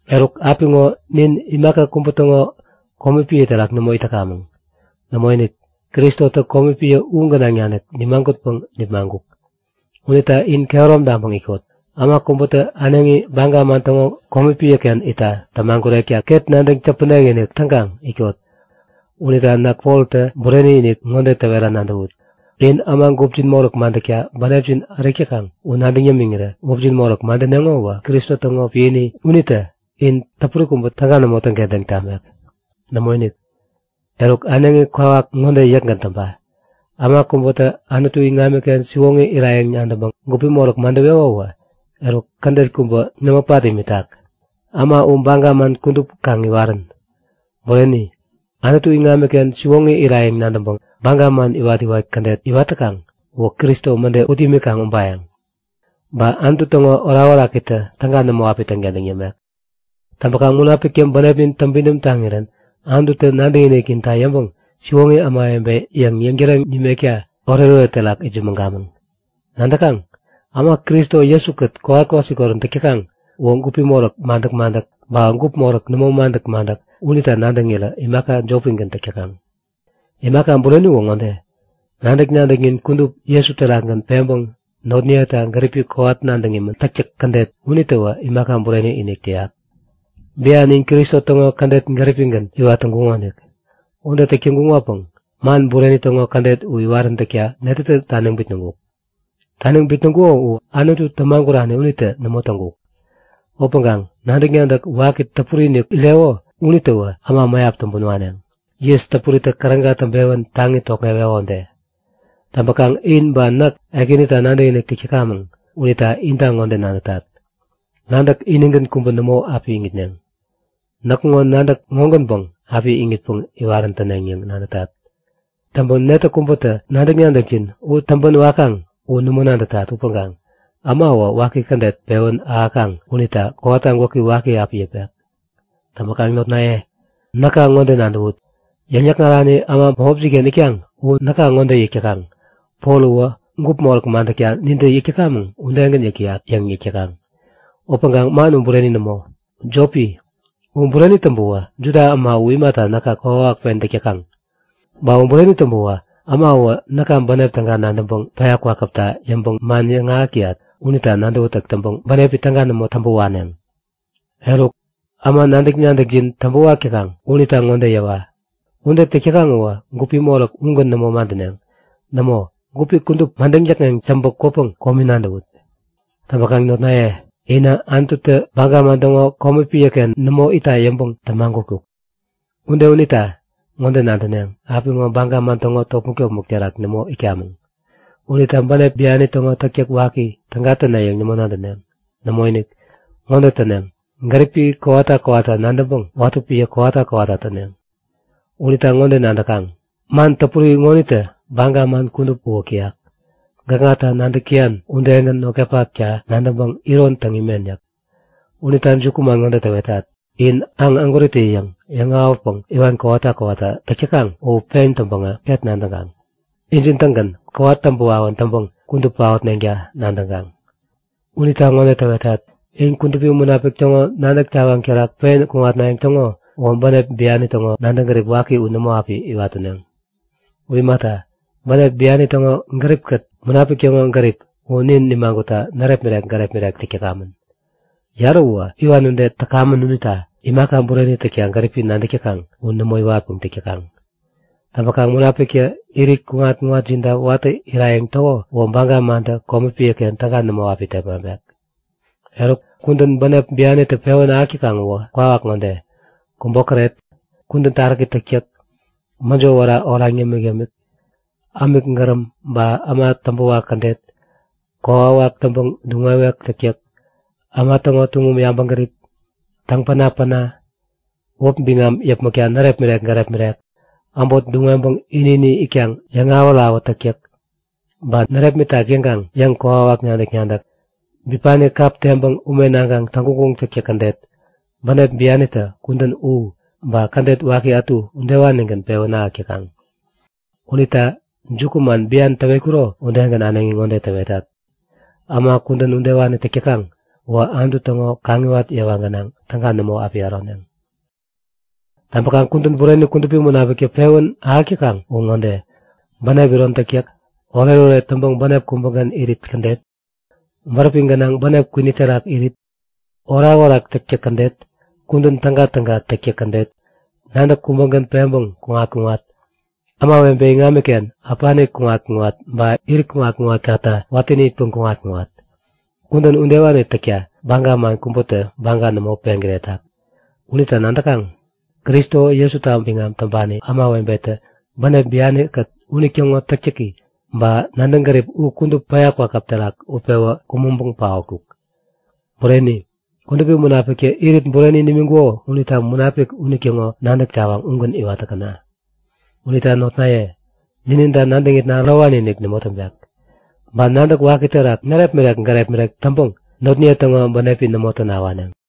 Eruk apiŋo nin imaka kubä täŋo komi piä terak nämo it täkamäŋ. Nämoinik, Kristotä komi piä u gänaŋ nanik nimagutpäŋ nipmaŋkuk. Unita in kehärom taŋpäŋ itkot. Äma kubätä äneŋi baga man täŋo komi piäken itta tämagurekta ket nadäŋ täpänek-inik täŋkaŋ itkot. Unita näk Poltä bureni-inik ŋode täwera nadäwut; In äma gupjin moräk madäkta bänepjin ärik täkaŋ u nadäŋ yämiŋirä gupjin moräk madäneŋo uwä Kristo täŋo piäni unitä in täpuri kubä täga nämo täŋkentäŋ tamek. Nämoinik! Eruk äneŋi kwawak ŋode yäkgän täŋpa; Äma kubätä Anutu iŋamiken siwoŋi irayäŋ nadäŋpäŋ gupi moräk madäweko uwä, eruk kädet kubä nämo pat imitak, äma u baga man kudup kaŋ iwarän! Bureni, Anutu iŋamiken siwoŋi itnayäŋ nadäŋpäŋ baga man iwat-iwat kädet iwat täkaŋ uwä Kristo mäde ut imikaŋ ubayäŋ. Ba Anutu täŋo orakorakitä täga nämo api täŋkentäŋ tamek. Täŋpäkaŋ Munapiktä bänepnin täŋpidäm taŋirän Anututä nadäkinikninta yäŋpäŋ siwoŋi ämawebe yäŋ yäŋtäreŋ nimekta oretoret terak itsämäŋkamäŋ. Nadäkaŋ? Äma Kristo Jesu-kät kowat kwasikorän täk täkaŋ uwä gup moräk madäk-madäk ba gup moräk nämo madäk-madäk unita nadäŋirä imaka jopigän täk täkaŋ. Imaka bureni uwä ŋode; Nadäk-nadäknin kudup Jesu terakgän peŋpäŋ notniyeta gäripi kowat nadäŋ imän täktäk kädet unitäwä imaka bureni-inik täyak. Bian in Kristo täŋo kädet gäripigän iwat täŋkuŋonik. Ude täk täŋkuŋopäŋ man bureni täŋo kädet u iwaräntäkta netätä taniŋ bitnäŋkuk? Taniŋ bitnäŋkuko u Anutu tämagurani unitä nämo täŋkuk. Upäŋkaŋ nadäk-nadäk waki täpuri-inik ireko unitäwä äma mäyap täŋpän waneŋ, yis täpuritä käräga täŋpewän taŋi tokŋeweko ude. Täŋpäkaŋ in ba näk Ekänita nadäkinik täk täkamäŋ unita inta ŋode nadätat; Nadäk inigän kubä nämo api iŋitneŋ. Näkŋo nadäk ŋogänpäŋ api iŋitpäŋ iwarän täneŋ yäŋ nadätat. Täŋpäŋ netä kubätä nadäk-nadäkjin u täŋpän wakaŋ u nämo nadätat upäŋkaŋ äma uwä waki kädet pewän ahäkaŋ unita kowata gwäki waki api yäpek. Täŋpäkaŋ notnaye, näka ŋode nadäwut; Täŋyäkŋarani äma bämopjin-ken itkaŋ u näka ŋode yäk täkaŋ; Pol uwä gup moräk madäkta nintä yäk täkamäŋ udegän yäk täyak yäŋ yäk täkaŋ. Upäŋkaŋ man u bureni nämo, jopi! U bureni täŋpäwä Juda äma u imata näka kokwawak pen täk täkaŋ? Ba u bureni täŋpäwä äma uwä näka bänep täga nadäŋpäŋ päya kwakäpta yäŋpäŋ man yäŋahäk täyat unita nadäwätäk täŋpäŋ bänepi täga nämo täŋpä waneŋ. Eruk, äma nadäk-nadäkjin täŋpäwak täkaŋ unita ŋode yäwa; Ude täk täkaŋ uwä gupi moräk ugän nämo madäneŋ. Nämo, gupi kudup madäŋ däkŋeŋ täŋpä kwäpäŋ komi nadäwut! Täŋpäkaŋ notnaye inä Anututä baga man täŋo komi piäken nämo itta yäŋpäŋ tämagutkuk. Ude unita ŋode nadäneŋ; Apiŋo baga man täŋo topmäk-topmäk terak nämo itkamäŋ unita bänep biani täŋo täktäk waki täga täne yäŋ nämo nadäneŋ. Nämoinik! Ŋode täneŋ; Gäripi kowata kowata nadäŋpäŋ watä piä kowata kowata täneŋ. Unita ŋode nadäkaŋ? Man täpuri ŋonitä baga man kudup uwäk täyak; Gäkŋata nadäk täyan udegän notkapakta nadäŋpäŋ iron täŋ imen yäk. Unita jukuman ŋode täwetat; In aŋ ägwäritä-yäŋ yäŋ-awätpäŋ iwan kowata kowata täk täkaŋ u pen täŋpäŋä ket nadäŋkaŋ; Injin-tägän kowat täŋpä wawän täŋpäŋ kudup paotneŋta nadäŋkaŋ! Unita ŋode täwetat; In Kudupi Munapik täŋo nadäk tawaŋ terak pen kuŋatnayäŋ täŋo uwä bänep biani täŋo nadäŋ gärip waki u nämo api iwat täneŋ. U imata, bänep biani täŋo gäripkät Munapik täŋo gärip u nin nimagutta närepmirek gärepmirek täk täkamän. Yarä uwä iwan ude täkamän unita imaka bureni täkta gäripi nadäk täkaŋ u nämo iwatpäŋ täk täkaŋ. Täŋpäkaŋ Munapiktä irit kuŋat-kuŋatjinta watäni irayäŋ täko uwä baga mantä komi piäken täga nämo api tepmaŋpek. Eruk kudän bänep bianitä pewän ahäk täkaŋ uwä kwawak ŋode; Kubokäret, kudän taräki täktäk, mäjo wära oraŋ yämik-yämik, ämik gäräm ba äma täŋpäwak kädet, kokwawak täŋpäŋ duŋ-wewek täktäk, äma täŋo tuŋum yabäŋgärip, täŋ-pänapäna, wäpi biŋam yäpmäkta närepmirek gärepmirek, äbot duŋ-weŋpäŋ ini-ini itkaŋ yäŋawät-awät täktäk, ba närepmitak yäŋkaŋ yäŋ-kokwawak nadäk-nadäk, bipani kap teŋpäŋ ume naŋkaŋ täŋguŋguŋ täktäk kädet. Bänep bianitä kudän u, ba kädet waki ätu udewanigän pewän ahäk täkaŋ. Unita jukuman bian täwetkuro udegän äneŋi ŋode täwetat; Äma kudän udewani täk täkaŋ uwä Anutu täŋo kaŋiwat yewa gänaŋ täga nämo api äroneŋ. Täŋpäkaŋ kudän bureni Kudupi Munapiktä pewän ahäk täkaŋ uwä ŋode; Bänep iron täktäk, oretoret täŋpäŋ bänep kubägän irit kädet, bäräpi gänaŋ bänep kwini terak irit, orakorak täktäk kädet, kudän tägatäga täktäk kädet, nadäk kubägän peŋpäŋ kuŋat-kuŋat, ämawebe iŋamiken äpani kuŋat-kuŋat ba irit kuŋat-kuŋatkata watäni itpeŋ kuŋat-kuŋat. Kudän udewani täkta baga man kubätä baga nämo peŋkiretak. Unita nadäkaŋ; Kristo Jesuta biŋam täŋpani ämawebetä bänep biankät unitäŋo täktäki ba nadäŋ gäripi u kudup päya kwakäp terak utpewä kumäŋpäŋ paotkuk. Bureni, Kudupi Munapiktä irit bureni nimiŋkuko unita Munapik unitäŋo nadäk tawaŋ ugän iwat täkäna! Unita notnaye, nininta nadäŋitna ärowani-inik nämo täŋpek, ba nadäk waki terak närepmirek gärepmirek täŋpäŋ notniye täŋo bänepi nämo täna waneŋ.